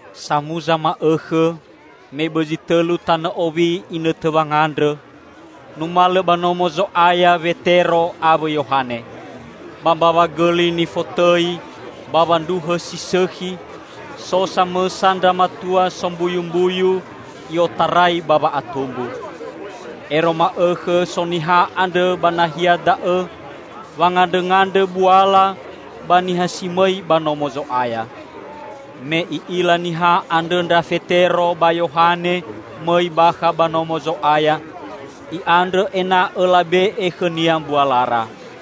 Samuza ma'õkhõ, me bõzi tõlu tanõ owi inõtõ wangandrõ, numalõ ba Nomo Zo'aya Wetero awõ Yohane. Ba mbawa gõli nifotõi "Bawa ndruhõ si Sõkhi", so samõsa ndra matua sombuyumbuyu i'otarai ba wa'atumbu. Ero ma'õkhõ so niha andrõ ba nahia da'õ wangandrõngandrõ buala ba niha si mõi ba Nomo Zo'aya. Me i'ila niha andrõ ndra Fetero ba Yohane mõi bakha ba Nomo Zo'aya, i'andrõ ena'õ labe'e khõnia mbualara.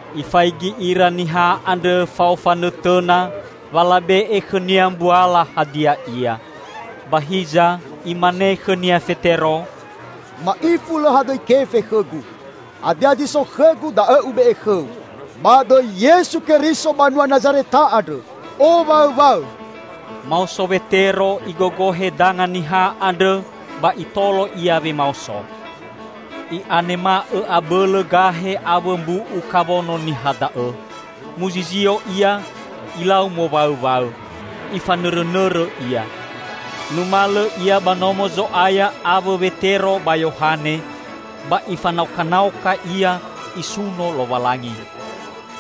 Ifaigi ira niha andrõ fao fanõtõna wa labe'e khõnia mbuala hadia ia. Ba hiza imane khõnia Fetero, "Ma'ifu lõ hadõi kefe khõgu. Hadia zi so khõgu da'õ ube'e khõu: Ba dõi Yesu Keriso banua Nazareta andrõ owaõwaõ!" Maoso Wetero igogohe danga niha andrõ ba itolo ia wemaoso. I'anema'õ abõlõ gahe awõ mbu'u kawono niha da'õ. Muzizio ia, ilau mowaõwaõ. Ifanõrõnõrõ ia. Numalõ ia ba Nomo Zo'aya awõ Wetero ba Yohane, ba ifanaokanaoka ia, isuno Lowalangi.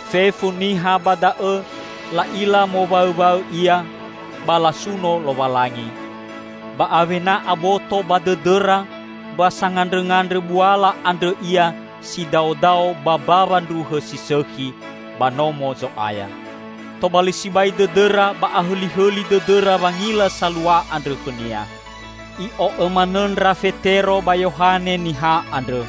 Fefu niha ba da'õ la'ila mowaõwaõ ia, ba lasunosuno Lowalangi. Ba awena aboto ba dõdõra wa sangandrõngandrõ buala andrõ ia si daodao ba "Mbawa ndruhõ si Sõkhi" ba Nomo Zo'aya. Tobali sibai dõdõra ba ahõlihõli dõdõra wangila salua andrõ khõnia. I'o'õ manõ ndra Fetero ba Yohane niha andrõ.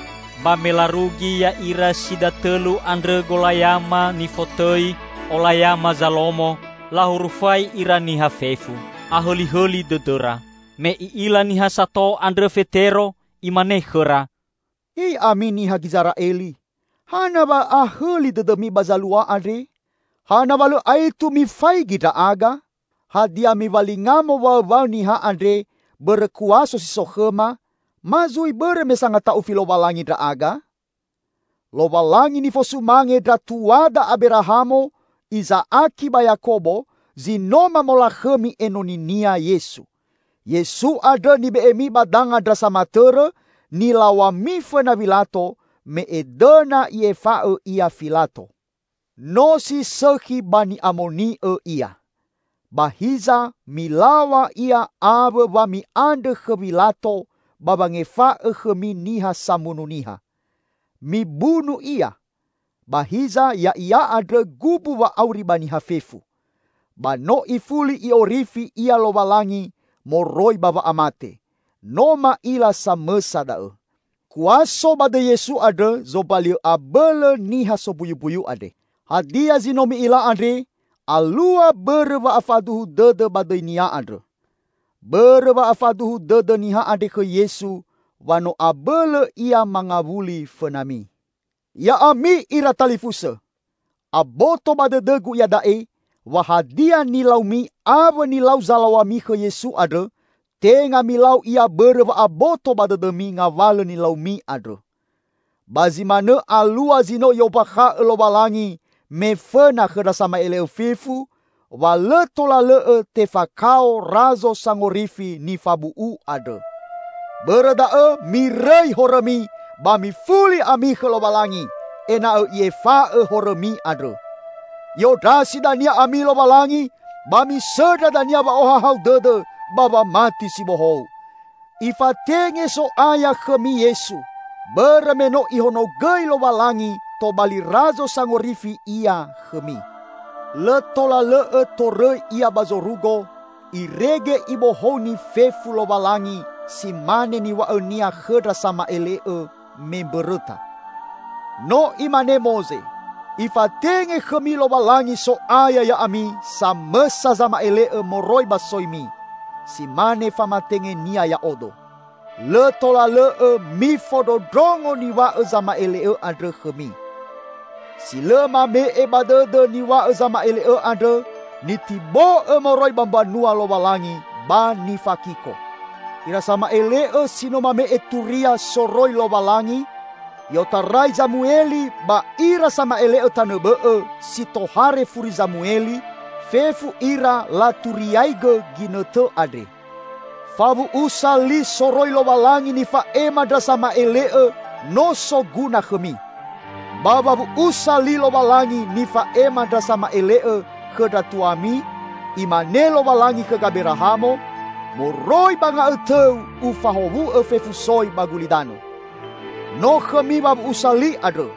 Ba me larugi ya'ira si datõlu andrõ golayama nifotõi "Olayama Zalomo", lahurufai ira niha fefu. Ahõlihõli dõdõra. Me i'ila niha sato andrõ Fetero, imane khõra, "He ya'ami niha Gizera'eli, hana wa ahõli dõdõmi ba zalua andre? Hana wa lõ aetu mifaigi ndra'aga? Hadia miwalinga mowaõwaõ niha andre bõrõ kuaso si so khõma, ma zui bõrõ me sangata'ufi Lowalangi ndra'aga? Lowalangi nifosumange ndra tuada Aberahamo, Iza'aki ba Yakobo, zi no mamolakhõmi Enoni-Nia Yesu. Yesu andrõ nibe'emi ba danga ndra samatõrõ, nilaw̃ami fõna Wilato, me edõna i'efa'õ Ia Filato. No si sõkhi ba ni'amoni'õ Ia. Ba hiza milaw̃a Ia awõ wa mi'andrõ khõ Wilato ba wangefa'õ khõmi niha samunu niha. Mibunu Ia. Ba hiza Ya'ia andrõ gumbu wa'auri ba niha fefu. Ba no ifuli I'orifi Ia Lowalangi moroi ba wa'amate. No ma'ila samõsa da'õ. Kuaso ba dõi Yesu andrõ zombali'õ abõlõ niha sombuyumbuyu andre. Hadia zi no mi'ila andre, alua bõrõ wa'afaduhu dõdõ ba dõi-Nia andrõ. Bõrõ wa'afaduhu dõdõ niha andre khõ Yesu wa no abõlõ ia mangawuli fõnami. Ya'ami ira talifusõ! Aboto ba dõdõgu iada'e wa hadia nilaumi awõ nilau zalaw̃ami khõ Yesu andrõ, tenga milau ia bõrõ wa'aboto ba dõdõmi ngawalõ nilaumi andrõ. Ba zi manõ alua zi no I'ombakha'õ Lowalangi me fõna khõ ndra sama'ele'õ fefu, wa lõ tola lõ'õ tefakao Razo Sangorifi nifabu'u andrõ. Bõrõ da'õ mirõi horõmi, ba mifuli ami khõ Lowalangi, ena'õ I'efa'õ horõmi andrõ. I'ondrasi dania ami Lowalangi, ba misõndra dania wa'ohahau dõdõ ba wamati si bohou. Ifatenge So'aya khõmi Yesu, bõrõ me no Ihonogõi Lowalangi tobali Razo Sangorifi Ia khõmi. Lõ tola lõ'õ torõi Ia ba zorugo irege Ibohouni fefu Lowalangi si mane niw̃a'õ-Nia khõ ndra sama'ele'õ me mbõrõta. No imane Moze, 'Ifatenge khõmi Lowalangi So'aya ya'ami samõsa zama'ele'õ moroi ba soimi, si mane famatenge-Nia ya'odo. Lõ tola lõ'õ mifondrondrongo niw̃a'õ zama'ele'õ andrõ khõmi. Si lõ mame'e ba dõdõ niw̃a'õ zama'ele'õ andrõ, nitibo'õ moroi ba mbanua Lowalangi ba nifakiko.' Ira sama'ele'õ si no mame'e Turia soroi Lowalangi, i'otarai Zamueli ba ira sama'ele'õ tanõ bõ'õ si tohare furi Zamueli, fefu ira laturiaigõ ginõtõ andre. Fawu'usa li soroi Lowalangi nifa'ema ndra sama'ele'õ no soguna khõmi. Ba wawu'usa li Lowalangi nifa'ema ndra sama'ele'õ khõ ndra tuami, imane Lowalangi khõ Gaberahamo, 'Moroi ba nga'õtõu Ufahowu'õ fefu soi ba gulidanõ.' No khõmi wawu'usa li andrõ.